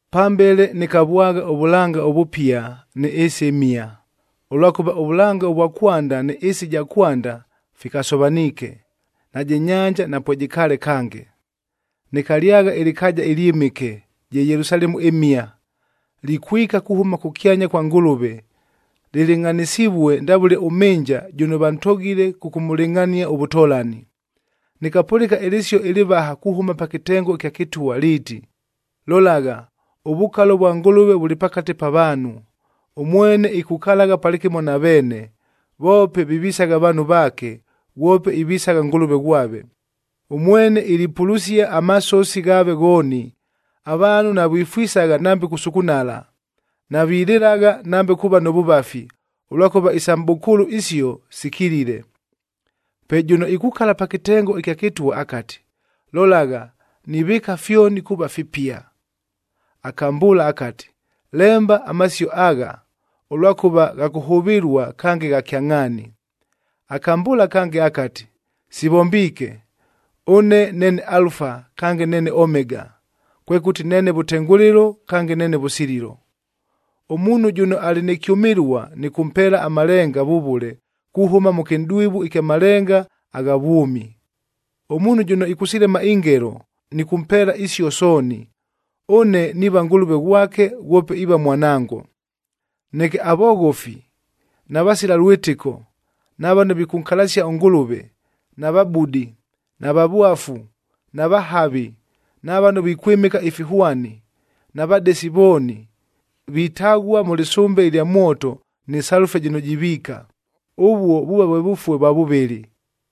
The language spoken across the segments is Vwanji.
Pambele nɨkavwagha ʉvʉlanga ʉvʉpia nɨ ɨɨsi ɨmhia, ʉlwakʉva ʉvʉlanga vwa kwanda nɨ ɨɨsi ɨja kwanda fikasovaniike, najɨ nyanja napwejɨkaale kange. Nɨkalyagha ɨlɨkaaja ɨlyɨmɨke, je Yelusalemu ɨmhia, likwika kuhʉma kʉkyanya kwa Ngʉlʉve, lɨlɨngʼhanɨsivue ndavʉle ʉmhɨnja jʉno vantogile kʉkʉmʉlɨngʼhania ʉvʉtolani. Nɨkapʉlɨka ɨlɨsio ɨlɨvaha kuhʉma pa kɨtengo ɨkya kɨtwa liiti, “Lolagha, ʉvukalo vwa Ngʉlʉve vʉlɨ pakate pa vaanhu! Ʉmwene ikukalagha palɨkɨmo na veene, voope vivisagha vaanhu vaake, ghwope ivisagha Ngʉlʉve ghwave. Ʉmwene ilipulusia amasosi ghaave ghooni. Avaanhu navifwisagha nambe kusukunala, navilɨlagha nambe kuuva nʉ vʉvafi, ʉlwakʉva isa mʼbʉkʉʉlʉ isio sikilile.” Pe jʉno ikukala pa kɨtengo ɨkya kɨtwa akati, “Lolagha, nivɨɨka fyoni kuuva fipia!” Akambʉʉla akati, “Lemba amasio agha, ʉlwakʉva gha kʉhʉvɨlua kange gha kyangʼhaani.” Akambʉʉla kange akati, “Sivombiike! Ʉne neene Alufa kange neene Omega, kwekʉti neene vʉtengʉlɨlo kange neene vʉsililo. Ʉmuunhu jʉno alɨ nɨ kyʉmɨlua nɨkʉmpeela amalenga vʉvʉle kuhʉma mʉ kɨnʼdwivu ɨkya malenga agha vwʉmi. Ʉmuunhu jʉno ɨkʉsilema ingelo, nɨkʉmpeela isio sooni, ʉne niiva Ngʉlʉve ghwake ghwope iiva mwanango. Neke avoghofi, na vasila lwɨtɨko, na vano vikʉnkalasia ʉNgʉlʉve, na vabudi, na vavwafu, na vahavi, na vano vikwɨmɨka ifihwani, na vadesi vooni, vitaghua mʉ lɨsʉmbe ɨlya mwoto nɨ salufaa jɨno jiviika. Ʉvuo vuuva vwe vʉfue vwa vʉvɨlɨ.”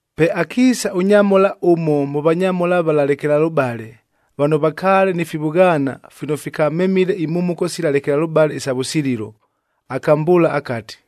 Pe akiisa ʉnyamhola ʉmo mʉ vanyamhola vala lekelalʉbale, vano vakaale ni fivʉghaana fino fikamemile imhumuko sila lekelalʉbale isa vʉsililo, akambʉʉla akati,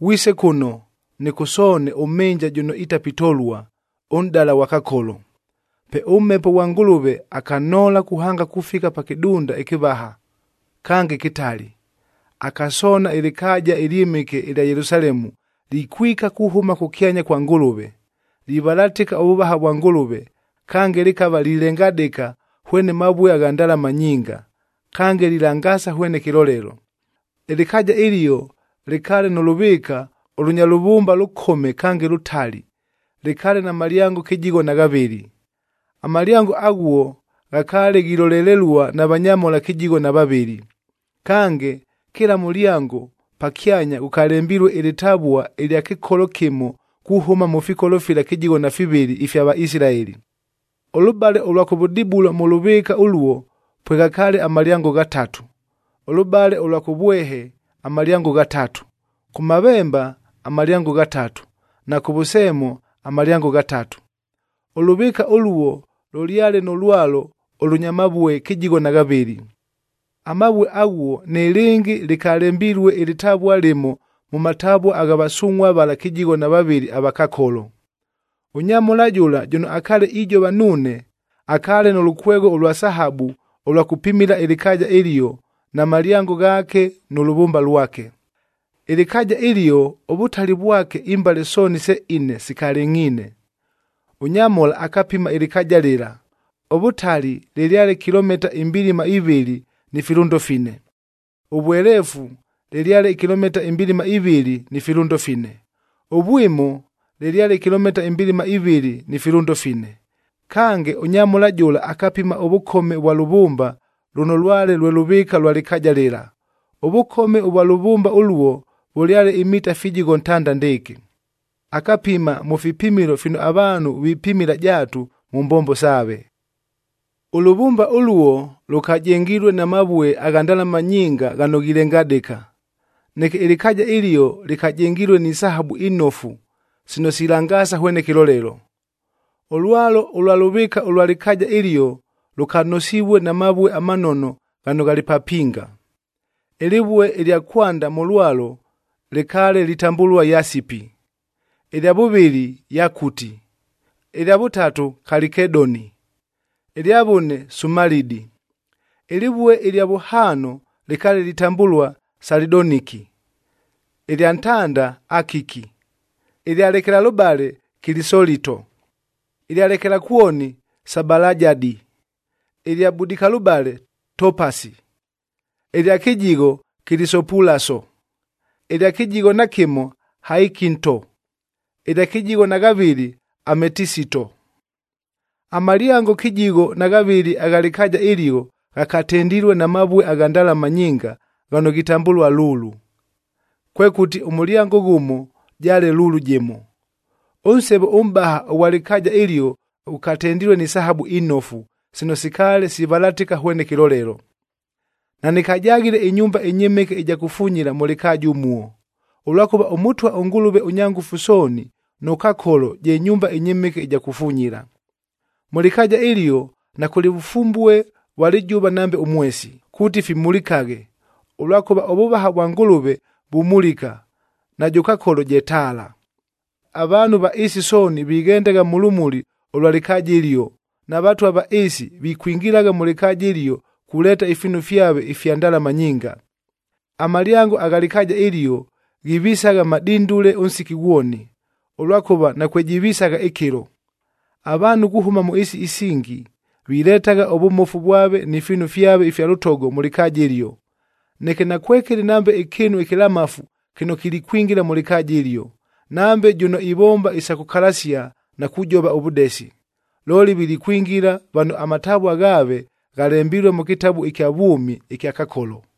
“Ghwise kʉno, nɨkʉsoone ʉmhɨnja jʉno itapitolua, ʉnʼdala ghwa Kakolo.” Pe ʉMhepo ghwa Ngʉlʉve akanhoola kuhanga kufika pa kɨdunda ɨkɨvaha, kange kɨtali. Akasoona ɨlɨkaaja ɨlyɨmɨke ɨlya Yelusalemu likwika kuhʉma kʉkyanya kwa Ngʉlʉve, livalatɨka ʉvʉvaha vwa Ngʉlʉve, kange lɨkava lilengadɨka hwene mavue agha ndalama nyinga, kange lilangaasa ghwene kɨlolelo. Ɨlɨkaaja ɨlio lɨkaale nʉ lʉvɨɨka ʉlʉnya lʉvʉmba lʉkome kange lʉtali, lɨkaale na malyango kɨjigho na ghavɨlɨ. Amalyango aghuo ghakaale ghilolelelua na vanyamhola kɨjigho na vavɨlɨ, kange kɨla mʉlyango pakyanya ghʉkalembilue ɨlɨtavua ɨlya kɨkolo kɨmo kuhʉma mʉ fikolo fila kɨjigho na fivɨlɨ ifya Vaisilaeli. Ʉlʉbale ʉlwa kʉvʉdibulo mʉ lʉvɨɨka ʉluo pweghakaale amalyango ghatatu, ʉlʉbale ʉlwa kʉvwehe amalyango ghatatu, kʉmavemba amalyango ghatatu, na kʉvʉseemo amalyango ghatatu. Ʉlʉvɨɨka ʉluo lʉlyale nʉ lwalo ʉlʉnya mavue kɨjigho na ghavɨlɨ. Amavue aghuo nɨlɨngɨ lɨkalembilue ɨlɨtavua lɨmo mʉ matavua gha vasungʼhua vala kɨjigho na vavɨlɨ ava Kakolo. Ʉnyamhola jʉla jʉno akaale ijova nuune akaale nʉ lʉkwegho ʉlwa sahabu ʉlwa kʉpimila ɨlɨkaaja ɨlio na malyango ghaake nʉ lʉvʉmba lwake. Ɨlɨkaaja ɨlio ʉvʉtali vwake imbale sooni se ine sikalɨngʼhiine. Ʉnyamhola akapima ɨlɨkaaja lɨla, ʉvʉtali lɨlyale kilomita imbilima ivɨlɨ ni filʉndo fine, ʉvweleefu lɨlyale kilomita imbilima ivɨlɨ ni filʉndo fine, ʉvwimo lɨlyale kilomita imbilima ivɨlɨ ni filʉndo fine. Kange, ʉnyamhola jʉla akapima ʉvʉkome vwa lʉvʉmba lʉno lwale lwe lʉvɨɨka lwa lɨkaaja lɨla. Ʉvʉkome ʉvwa lʉvʉmba ʉluo vʉlyale imita fijigho ntanda ndɨɨkɨ. Akapima mʉ fipimilo fino avaanhu vipimila jaatu mʉ mbombo saave. Ʉlʉvʉmba ʉluo lʉkajengilue na mavue agha ndalama nyinga ghano ghilengadɨka. Neke ɨlɨkaaja ɨlio lɨkajengilue ni sahabu inofu sino silangaasa hwene kɨlolelo. Ʉlwalo ʉlwa lʉvɨɨka ʉlwa lɨkaaja ɨlio lʉkanosivue na mavue amanono ghano ghalɨ papinga. Ɨlɨvue ɨlya kwanda mʉ lwalo lɨkaale litambʉlua yasipi, ɨlya vʉvɨlɨ yakuti, ɨlya vʉtatu kalikedoni, ɨlya vʉne sumalidi. Ɨlɨvue ɨlya vʉhaano lɨkaale litambʉlua salidoniki, ɨlya ntanda akiki, ɨlya lekelalʉbale kilisolito, ɨlya lekelakwoni sabalajadi, ɨlya budikalʉbale topasi, ɨlya kɨjigho kilisopulaso, ɨlya kɨjigho na kɨmo haikinto, ɨlya kɨjigho na ghavɨlɨ ametisito. Amalyango kɨjigho na ghavɨlɨ agha lɨkaaja ɨlio ghakatendilue na mavue agha ndalama nyinga ghano ghitambʉlua lulu, kwekʉti ʉmʉlyango ghʉmo jaale lulu jɨmo! Ʉnsevo ʉmʼbaha ʉghwa lɨkaaja ɨlio ghʉkatendilue ni sahabu inofu, sino sikaale sivalatɨka hwene kɨlolelo. Nanɨkajaghile ɨnyumba ɨnyɨmɨke ɨja kufunyila mʉ lɨkaaja ʉmuo, ʉlwakʉva ʉMʉtwa ʉNgʉlʉve ʉNyangʉfu Sooni nʉ Kakolo je nyumba ɨnyɨmɨke ɨja kufunyila. Mʉ lɨkaaja ɨlio nakʉlɨ vʉfumbue vwa lɨjʉva nambe ʉmwesi, kuuti fimulikaghe, ʉlwakʉva ʉvʉvaha vwa Ngʉlʉve vumulika, najʉ Kakolo je taala. Avaanhu va ɨɨsi sooni vighendagha mʉ lʉmuli ʉlwa lɨkaaja ɨlio, na vatwa va ɨɨsi vikwingilagha mʉ lɨkaaja ɨlio kuleeta ifiinu fyave ifya ndalama nyinga. Amalyango agha lɨkaaja ɨlio ghivisagha madindule ʉnsiki ghwoni, ʉlwakʉva nakwejivisagha ɨkɨlo. Avaanhu kuhʉma mʉ ɨɨsi isingi viletagha ʉvʉmofu vwave ni fiinu fyave ifya lʉtogo mʉ lɨkaaja ɨlio. Neke nakwekɨlɨ nambe ɨkɨɨnu ɨkɨlamafu kɨno kilikwingila mʉ lɨkaaja ɨlio, nambe jʉno ivomba isa kʉkalasia na kujova ʉvʉdesi. Looli, vilikwingila vano amatavua ghaave ghalembilue mʉ kɨtabu ɨkya vwʉmi ɨkya Kakolo.